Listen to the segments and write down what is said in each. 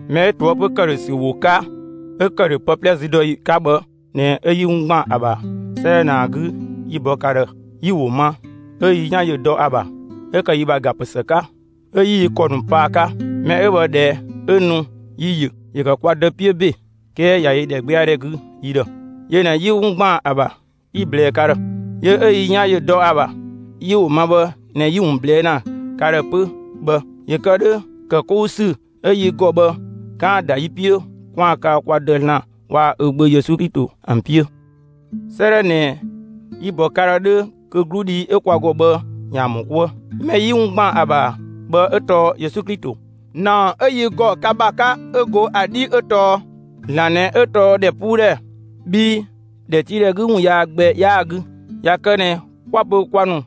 Mɛ 'ö ꞊toëpö ‑këdhösü ‑wo 'ka, 'ö ‑kë ‑dhö pë 'plɛ züdɔyi 'ka bhë ꞊nɛ 'ö 'yi 'wun ‑gban ‑a ‑bha 'sëëdhɛ ꞊nɛ ‑a 'gü, 'yi‑ bɔ ka ‑dhë; yi‑ ‑wo ‑ma, 'ö yi 'yan ‑yö ‑dɔ ‑a ‑bha, 'ö ‑kë yi ‑bha ‑ga ‑pë ‑së 'ka. 'Ö 'yi yi ‑kɔ ‑nu pa ‑a 'ka. Mɛ 'ö bhë, ꞊dhɛ 'ö nu, yi‑ ‑yö; ‑yö ‑kë kwa Dë 'piö ‑be; 'kɛɛ ꞊ya yö ‑dhɛgbɛadhɛ 'gü yi ‑dhë. Yö ꞊nɛ 'yi 'wun ‑gban ‑a ‑bha 'yi‑ ꞊blɛɛ ka ‑dhë. Yö 'ö yi 'yan ‑yö dɔ ‑a ‑bha, 'yi‑ ‑wo ma bhë ꞊nɛ 'yi‑ ‑wun ꞊blɛɛ' ‑na ka ‑dhë 'pö bhë, ‑yö kë 'dhö ‑kë 'kou ‑sü 'ö yi ‑gɔ bhë, 'kaan‑ ‑da yi 'piö, 'kwaan‑ kaa kwa Dë (‑Zlan) waa‑ ö Gbö Yesu Klito ‑an 'piö. 'Sëëdhɛ ꞊nɛ, yi‑ ‑bɔ ka ‑dhë 'dhö kö 'gludhi 'ö kwa ‑gɔ bhë, ‑yaan ‑mɔ 'kuë. Mɛ 'yi 'wun ‑gban ‑a ‑bha bhë 'ö tɔɔ Yesu Klito. ‑Naɔ 'ö yi ‑gɔ ka ‑bha 'ka 'ö go ‑a 'dhi 'ö tɔɔ: ‑Zlan ꞊nɛ 'ö tɔɔ ‑dhɛpuudhɛ; bhii ‑dhɛtiidhɛ 'gü ‑wun yaa gbɛ 'yaa‑ 'gü. ꞊Ya kë ꞊nɛ 'kwa‑ pö kwa ‑nu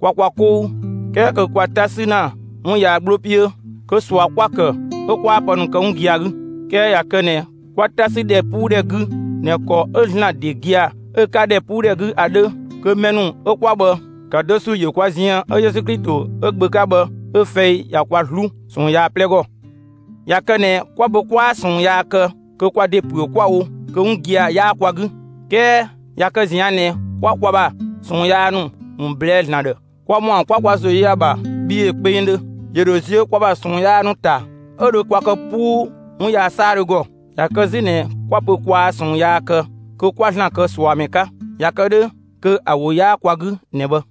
kwa kwa 'kou, 'kɛɛ kö kwa 'ta ‑sü ‑na 'wun yaa 'gbloo 'piö kö ꞊sua 'kwa‑ kë 'ö 'kwaa pë ‑nu kë 'wun gia‑ 'gü. 'Kɛɛ ꞊ya kë ꞊nɛ 'kwa 'ta 'sü ‑dhɛpuudhɛ 'gü ꞊nɛ ‑kɔ 'ö ‑Zlan ‑de gia‑ 'ö‑ 'ka ‑dhɛpuudhɛ 'gü ‑a 'dhö, kö mɛ ‑nu 'ö 'kwa bhë, ‑kë do ‑sü ‑yö kwa ziën 'ö Yesu Klito 'ö‑ Gbö 'ka bhë 'ö‑ fɛi ꞊ya kwa 'zlu ꞊sɔɔn yaa 'plɛ ‑gɔ. ꞊Ya kë ꞊nɛ 'kwa‑ pö 'kwaa ꞊sɔɔn yaa kë, kö kwa ‑de ‑püö 'kwa‑ wo; kö 'wun gia‑ 'yaa kwa 'gü. 'Kɛɛ ꞊ya kë ꞊zian' ꞊nɛ 'kwa kwa ‑bha ꞊sɔɔn yaa ‑nu ‑wun ꞊blɛɛ'‑ ‑Zlan ‑dhë, kwa ‑mɔa 'kwa kwa ‑zo yö ‑a ‑bha bhii ‑yö kpengdhö; ‑yö ‑dho ziö kwa ‑bha ꞊sɔɔn yaa ‑nu ‑ta, 'ö dho kwa kë 'puu 'wun yaa 'saadhö ‑gɔ. ꞊Ya kë 'zü ꞊nɛ 'kwa‑ pö kwaa ꞊sɔɔn yaa kë, kö 'kwa ‑Zlan kë ꞊suamɛ 'ka. ꞊Ya kë 'dhö kö ‑a ‑wo 'yaa kwa 'gü ꞊nɛ bhë.